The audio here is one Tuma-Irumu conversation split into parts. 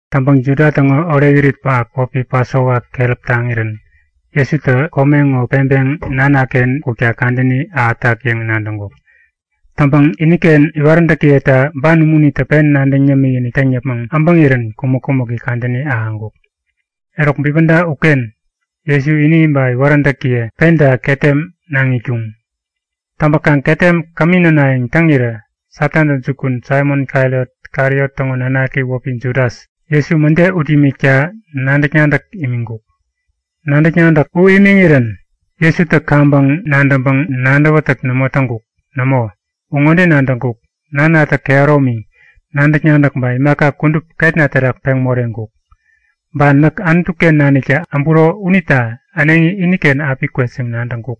Täŋpäŋ Juda täŋo orekirit pähap wäpi Pasova keräp taŋirän Jesutä kome ŋo peŋpeŋ Nanaken kukta kadäni ahätak yäŋ nadäŋkuk. Täŋpäŋ iniken iwaräntäkiyeta ban umunitä pen nadäŋ yämikinik täŋ yäpmäŋ äbäŋirän kumäk-kumäki kadäni ahäŋkuk. Eruk bipäda uken Jesu ini ba iwaräntäkiye penta ketem naŋ itkuŋ. Täŋpäkaŋ ketem kämi nänayäŋ täŋirä Satantä jukun Saimon-Kariot täŋo nanaki wäpi Judas, Jesu mäde ut imikta nadäk-nadäk imiŋkuk. Nadäk-nadäk u imiŋirän Jesutä kaŋpäŋ nadäŋpäŋ nadäwätäk nämo täŋkuk. Nämo, u ŋode nadäŋkuk; Nanatä kehäromi, nadäk-nadäk ba imaka kudup ketna terak peŋ moreŋkuk. Ba näk Anutu-ken naniktä äburo unita äneŋi iniken api kwet yäŋ nadäŋkuk.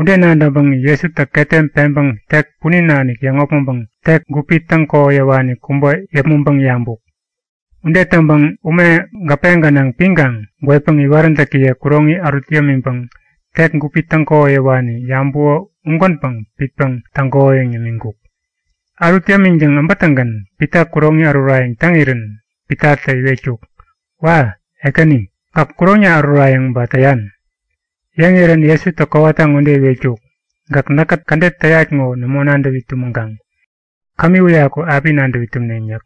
Ude nadäŋpäŋ Jesutä ketem peŋpäŋ tek punin nanik yäŋopmäŋpäŋ tek, gupi täŋ-kohoyäwani kubä yäpmäŋpäŋ yabuk. Ude täŋpäŋ ume gäpe gänaŋ piŋkaŋ gwetpäŋ iwaräntäkiye kuroŋi ärut yämiŋpäŋ tek gupi täŋ kohoyäwani yabuko ugänpäŋ pitpäŋ täŋkohoyäŋ yämiŋkuk. Ärut yämiŋtäŋ äbätäŋgän Pita kuroŋi ärurayäŋ täŋirän Pitatä iwetkuk; Wa! Ekäni, gäk kuroŋna ärurayäŋ ba täyan? Yäŋirän Jesutä kowata ŋode iwetkuk; Gäk näkä kädet täyat ŋo nämo nadäwi tumäŋkaŋ. Kämi uyaku api nadäwi tumneŋ yäk.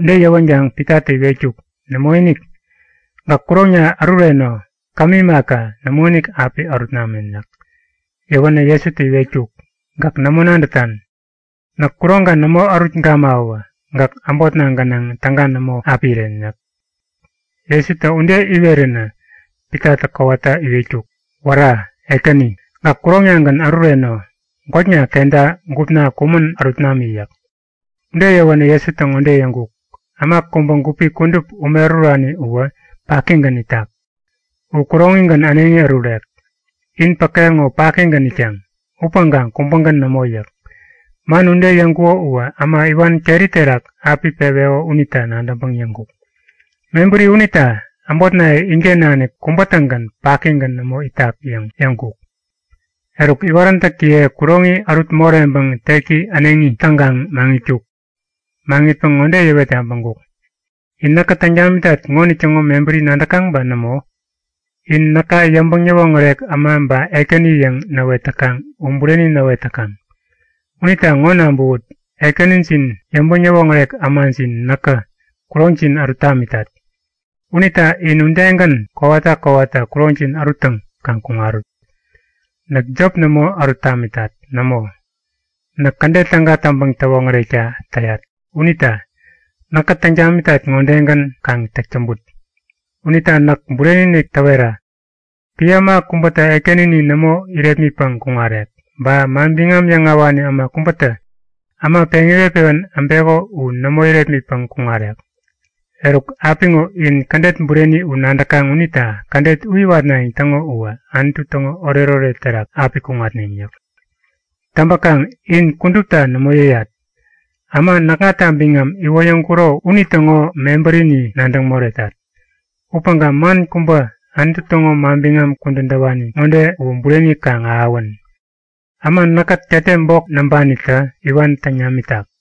Ude yäwänkaŋ Pitatä iwetkuk; Nämoinik! Gäk kuroŋna ärureno. Kämi imaka, nämoinik api ärut namen yäk. Yäwänä Jesutä iwetkuk; Gäk nämo nadätan. Näk kuroŋka nämo ärut gamawä gäk äbotna gänaŋ täga nämo api iren yäk. Jesutä ude iweränä Pitatä kowata iwetkuk; Wära! Ekäni, gäk kuroŋnagän ärureno. Gwäkna ketna, gupna kumän ärut nami! yäk. Ude yäwänä Jesutä ŋode yäŋkuk; Äma kubä gupi kudup ume ärurani uwä pakigän itak. U kuroŋigän äneŋi ärurek. In päke ŋo pakigän itkaŋ. Upäŋkaŋ kubägän nämo yäk. Man ude yäŋkuko uwä äma iwan keri terak api peweko unita nadäŋpäŋ yäŋkuk. Mebäri unita äbotnaye inken nanik kubä-tägän pakigän nämo itak yäŋ yäŋkuk. Eruk, iwaräntäkiye kuroŋi ärut moreŋpäŋ teki äneŋi täŋkaŋ maŋitkuk. Maŋitpäŋ ŋode yäwet yabäŋkuk; In näkä täŋ tamitat ŋonitäŋo mebäri nadäkaŋ ba nämo? In näka yäŋpäŋ-yäwoŋärek äma ba ekäni yäŋ näwet täkaŋ u bureni näwet täkaŋ. Unita ŋo nabäwut; Ekänijin, yäŋpäŋ-yäwoŋärek ämajin näkä kuroŋjin ärut tamitat. Unita in udegän kowata kowata kuroŋjin äruttäŋ kaŋ kuŋarut. Näk jop nämo ärut tamitat. Nämo, näk kädet täga täŋpäŋ-täwoŋärekta täyat. Unita näkä täŋ tamitat ŋodegän kaŋ täk täŋput. Unita näk bureni-inik täwetat; Epän äma kubätä Ekänini nämo irepmitpäŋ kuŋarek. Ba manbiŋam yäŋahäwani äma kubätä äma peŋ iwet-pewän äbeko u nämo irepmitpäŋ kuŋarek. Eruk, apiŋo in kädet bureni u nadäkaŋ unita kädet u iwatnayäŋ täŋo uwä Anutu täŋo oretoret terak api kuŋatneŋ yäk. Täŋpäkaŋ in kudupta nämo yäyat. Äma näkŋata biŋam iwoyäŋkuro unitäŋo mebärini nadäŋ moretat. Upäŋkaŋ man kubä Anutu täŋo manbiŋam kudän täwani ŋode uwä bureni kaŋ ahäwän; Äma näkkät ketem bok näŋpanitä iwan täŋ namitak.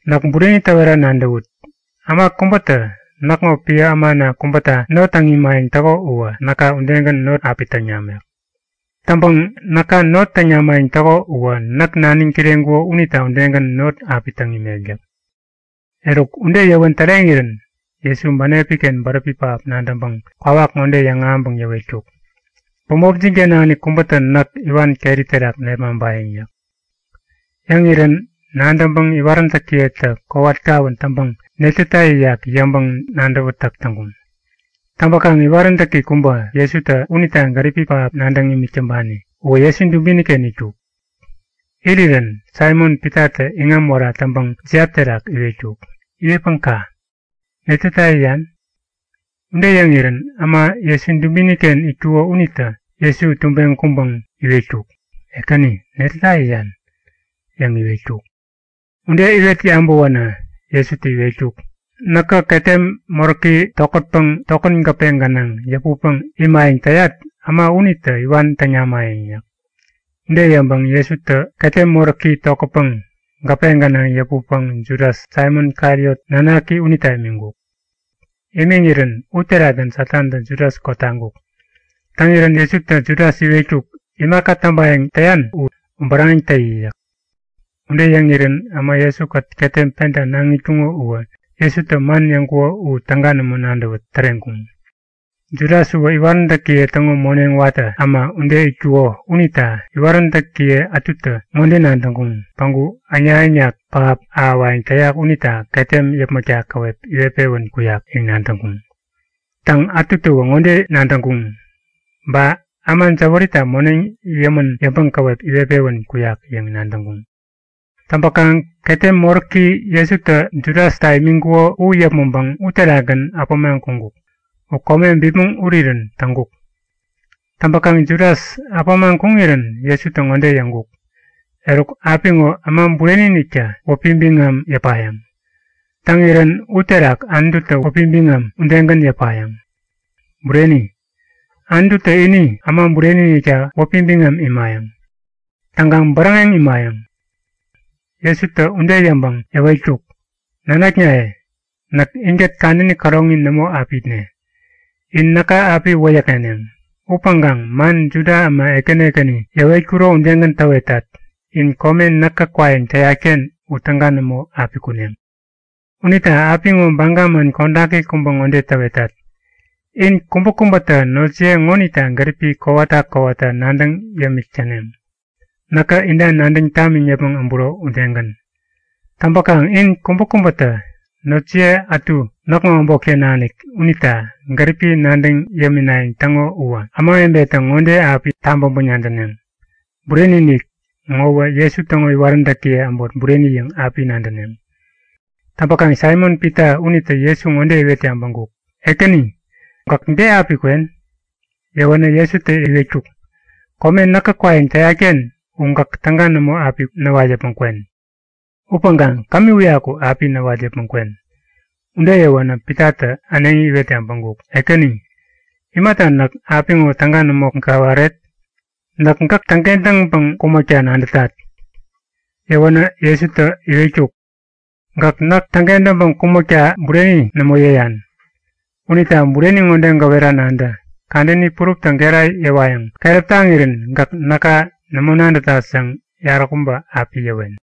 Näk bureni täwera nadäwut; Äma kubätä näkŋo epän ämana kubäta not täŋ imayäŋ täko uwä näka udegän not api täŋ namek. Täŋpäŋ näka not täŋ namayäŋ täko uwä näk naniŋ kireŋkuko unita udegän not api täŋ imek yäk. Eruk, ude yäwän täreŋirän, Jesu bänepi-ken bäräpi pähap nadäŋpäŋ kwawak ŋode yäŋahäŋpäŋ yäwetkuk; Bämopjin-ken nanik kubätä näk iwan keri terak nepmaŋpayäŋ yäk. Yäŋirän nadäŋpäŋ iwaräntäkiyetä kowat kawän täŋpäŋ netäta yäyak yäŋpäŋ nadäwätäk täŋkuŋ. Täŋpäkaŋ iwaräntäki kubä, Jesutä unita gäripi pähap nadäŋ imik täŋpani uwä Jesu dubini-ken itkuk. Irirän Saimon-Pitatä iŋam wära täŋpäŋ jiap terak iwetkuk; Iwetpäŋ ka; Netäta yäyan? Ude täŋirän äma Jesu dubini-ken itkuko unitä Jesu tubeŋ kuŋpäŋ iwetkuk; Ekäni, netäta yäyan? yäŋ iwetkuk. Ude iwet yabäwänä Jesutä iwetkuk; Näkä ketem moräki tokätpäŋ tokän gäpe gänaŋ yäputpäŋ imayäŋ täyat äma unitä iwan täŋ namayäŋ yäk. Jesutä ude yäŋpäŋ ketem moräki tokätpäŋ gäpe gänaŋ yäputpäŋ Judas, Saimon-Kariot nanaki unita imiŋkuk. Imiŋirän uterakgän Satantä Judas kotaŋkuk. Täŋirän Jesutä Judas iwetkuk; Imaka täŋpayäŋ täyan u bäräŋeŋ täyi yäk. Ude yäŋirän äma Jesu-kät ketem penta naŋ itkuŋo uwä Jesutä man yäŋkuko u täga nämo nadäwä täreŋkuŋ. Judas uwä iwaräntäkiye täŋo moneŋ watä äma ude itkuko unita iwaräntäkiye ätutä ŋode nadäŋkuŋ; Päŋku äŋnak-äŋnak pähap ahäwayäŋ täyak unita ketem yäpmäkta käwep iwet-pewän kuyak yäŋ nadäŋkuŋ. Täŋpäŋ ätutäwä ŋode nadäŋkuŋ; Ba äma jäwärita moneŋ yämän yäŋpäŋ käwep iwet-pewän kuyak yäŋ nadäŋkuŋ. Täŋpäkaŋ ketem moräki Jesutä Judasta imiŋkuko u yäpmäŋpäŋ uterakgän äpämaŋ kuŋkuk. U kome bipmäŋ urirän täŋkuk. Täŋpäkaŋ Judas äpämaŋ kuŋirän Jesutä ŋode yäŋkuk; Eruk, apiŋo Äma Bureni-iniktä wäpi biŋam yäpayäŋ. Täŋirän uterak Anututä wäpi biŋam udegän yäpayäŋ. Bureni! Anututä ini Äma Bureni-inikta wäpi biŋam imayäŋ. Täŋkaŋ bäräŋeŋ imayäŋ. Jesutä ude yäŋpäŋ yäwetkuk; Nanaknaye, näk inkät kadäni käroŋi nämo api itne. In näka api wäyäkŋeneŋ. Upäŋkaŋ man Juda äma ekäni ekäni yäwetkuro udegän täwetat; In kome näkä kwayäŋ täyat-ken u täga nämo api kuneŋ. Unita apiŋo baga man kodaki kubä ŋode täwetat; In kubäkubätä notjiye ŋonita gäripi kowata kowata nadäŋ yämik täneŋ, näkä inta nadäŋ tamiŋ yäpmäŋ äburo udegän. Täŋpäkaŋ in kubäkubätä notjiye ätu näkŋo äbotken nanik unita gäripi nadäŋ yäminayäŋ täŋo uwä ämawebetä ŋode api tabäŋpäŋ nadäneŋ; Bureni-inik, ŋowä Jesu täŋo iwaräntäkiye äbot bureni yäŋ api nadäneŋ. Täŋpäkaŋ Saimon-Pita unitä Jesu ŋode iwet yabäŋkuk; Ekäni, gäk de api kwen? Yäwänä Jesutä iwetkuk; Kome näkä kwayäŋ täyat-ken u gäk täga nämo api näwat yäpmäŋ kwen. Upäŋkaŋ kämi uyaku api näwat yäpmäŋ kwen. Ude yäwänä Pitatä äneŋi iwet yabäŋkuk; Ekäni, imata näk apiŋo täga nämo gäwaret? Näk gäk täŋkentäŋpäŋ kumäkta nadätat! Yäwänä Jesutä iwetkuk; Gäk näk täŋkentäŋpäŋ kumäkta bureni nämo yäyan. Unita bureni ŋode gäwera nadä; Kadäni puruptä gera yäwayäŋ keräp taŋirän gäk näka nämo nadätat yäŋ yaräkubä api yäwen.